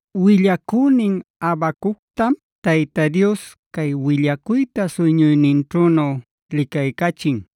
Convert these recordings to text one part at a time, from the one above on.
Willacünin Habacuctam Tayta Dios cay willacuyta suyñuyninćhünu licaycachin.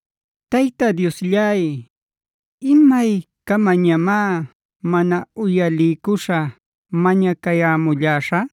Tayta Diosllay, ¿imaycamañamá mana uyaliycuśha mañacayämulläśhä?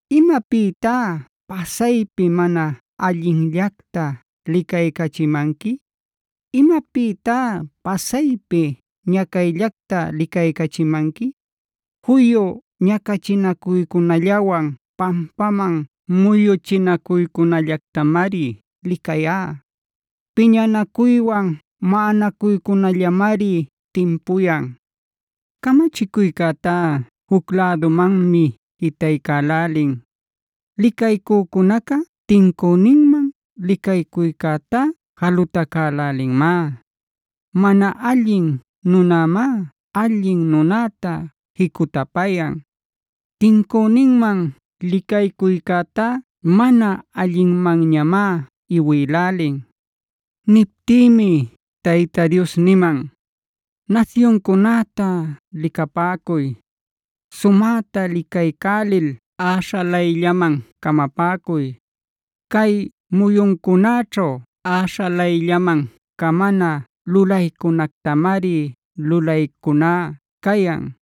¿Imapïtá pasaypi mana allinllacta licaycachimanqui? ¿Imapïtá pasaypi ñacayllacta licaycachimanqui? Juyu ñacachinacuycunallawan pampaman muyuchinacuycunallactamari licayá. Piñanacuywan maꞌananacuycunallañamari timpuyan. Camachicuycätá juc lädumanmi jitaycälälin; licaycücunaca tincüninman licaycuycätá jalutacälälinmá. Mana allin nunämá allin nunäta jicutapayan. Tincüninman licaycuycäta mana allinmanñamá iwïlälin. Niptïmi Tayta Dios niman: “Nasyuncunäta licapäcuy; sumäta licaycälil äśhalayllaman camapäcuy. Cay muyuncunäćhu äśhalayllaman camana lulaycunactamari lulaycuná cayan;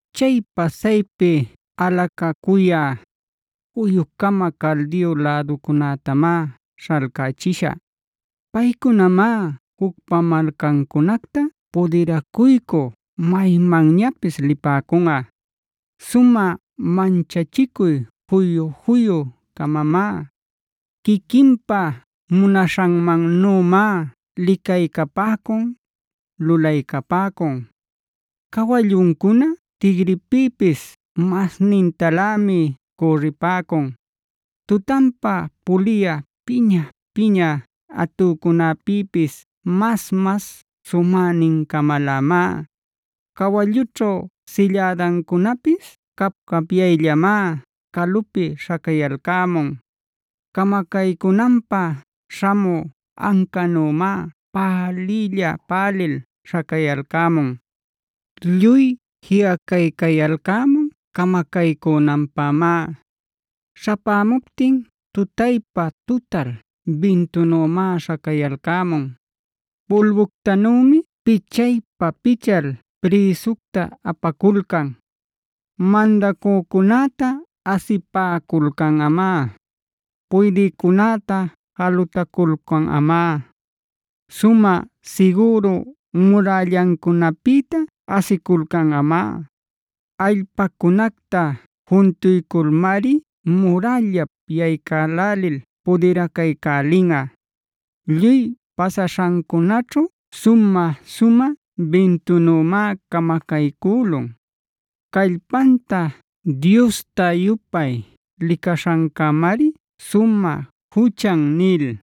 Chay pasaypi alacacuyä, juyu-cama Caldeo läducunätamá śhalcachishä.c Paycunamá jucpa malcancunacta pudiracuycü maymanñapis lipäcunꞌa. Sumä manchachicuy juyu-juyu-camamá; quiquinpa munaśhanmannümá licaycapäcun, lulaycapäcun. Cawalluncuna tigripïpis masnintalämi cürripäcun; tutanpa puliyä piña-piña atücunapïpis mas-mas sumänin-camalämá. Cawallućhu sillädancunapis cap-capyayllamá calupi śhacayalcämun. Camacaycünanpä śhamü ancanümá päliylla-pälil śhacayalcämun. Lluy jiꞌacaycayalcämun camacaycünanpämá. Śhapämuptin tutaypa-tutal bintunümá śhacayalcämun. Pulbuctanümi pichaypa-pichal prïsucta apaculcan. Mandacücunäta asipäculcanꞌamá; puydïcunäta jalutaculcanꞌamá. Sumä sigüru murällacunäpïta asiculcanꞌamá; allpacunacta juntuyculmari murällap yaycälälil pudiracaycälinꞌa. Lluy pasaśhancunäćhu sumä-sumä bintunümá camacaycülun. Callpanta diosta-yupay licaśhancämari sumä juchan” nil.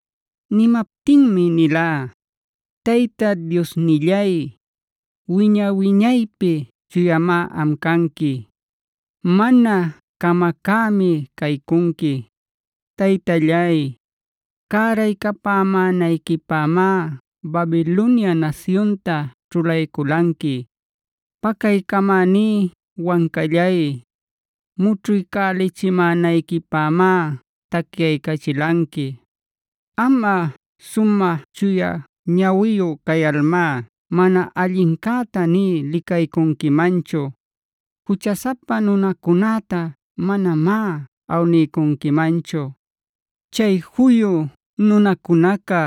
Nimaptinmi nilá: “Tayta Diosnillay, wiña-wiñaypi Chuyamá am canqui. Mana camacämi caycunqui. Taytallay, cäraycapämänayquipämá Babilonia nasyunta ćhulayculanqui. Pacaycamäní Wancallay, mućhuycälichimänayquipämá tacyaycachilanqui. Amꞌa, sumä chuya ñawiyu cayalmá mana allincäta nï licaycunquimanchu; juchasapa nunacunäta manamá awniycunquimanchu. ¿Chay juyu nunacunaca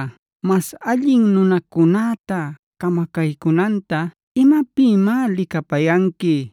mas allin nunacunäta camacaycunanta imapïmá licapayanqui?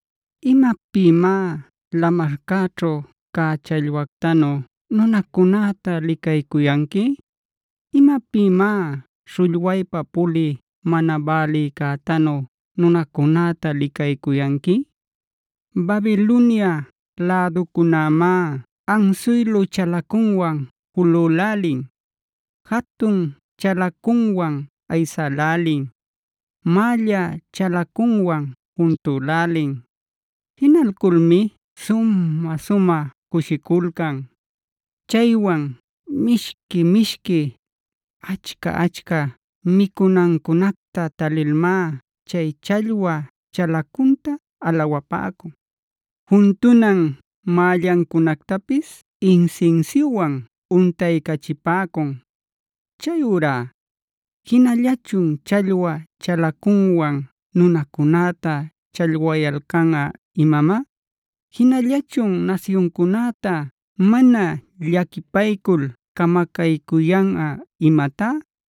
“¿Imapïmá lamarcäćhu cä challwactanu nunacunäta licaycuyanqui? ¿Imapïmá śhullwaypa pulï mana bälïcätanu nunacunäta licaycuyanqui? Babilonia läducunämá ansuylu chalacunwan julülälin, jatun chalacunwan aysälälin, mälla chalacunwan juntülälin. Jinalculmi sumä-sumä cushiculcan. Chaywan mishqui-mishqui, achca-achca micunancunacta talilmá chay challwa chalacunta alawapäcun; juntunan mällancunactapis insinsiuwan untaycachipäcun. Chayurá ¿jinallachun challwa chalacunwan nunacunäta challwayalcanꞌa imamá? ¿Jinallachun nasyuncunäta mana llaquipaycul camacaycuyanꞌa imatá?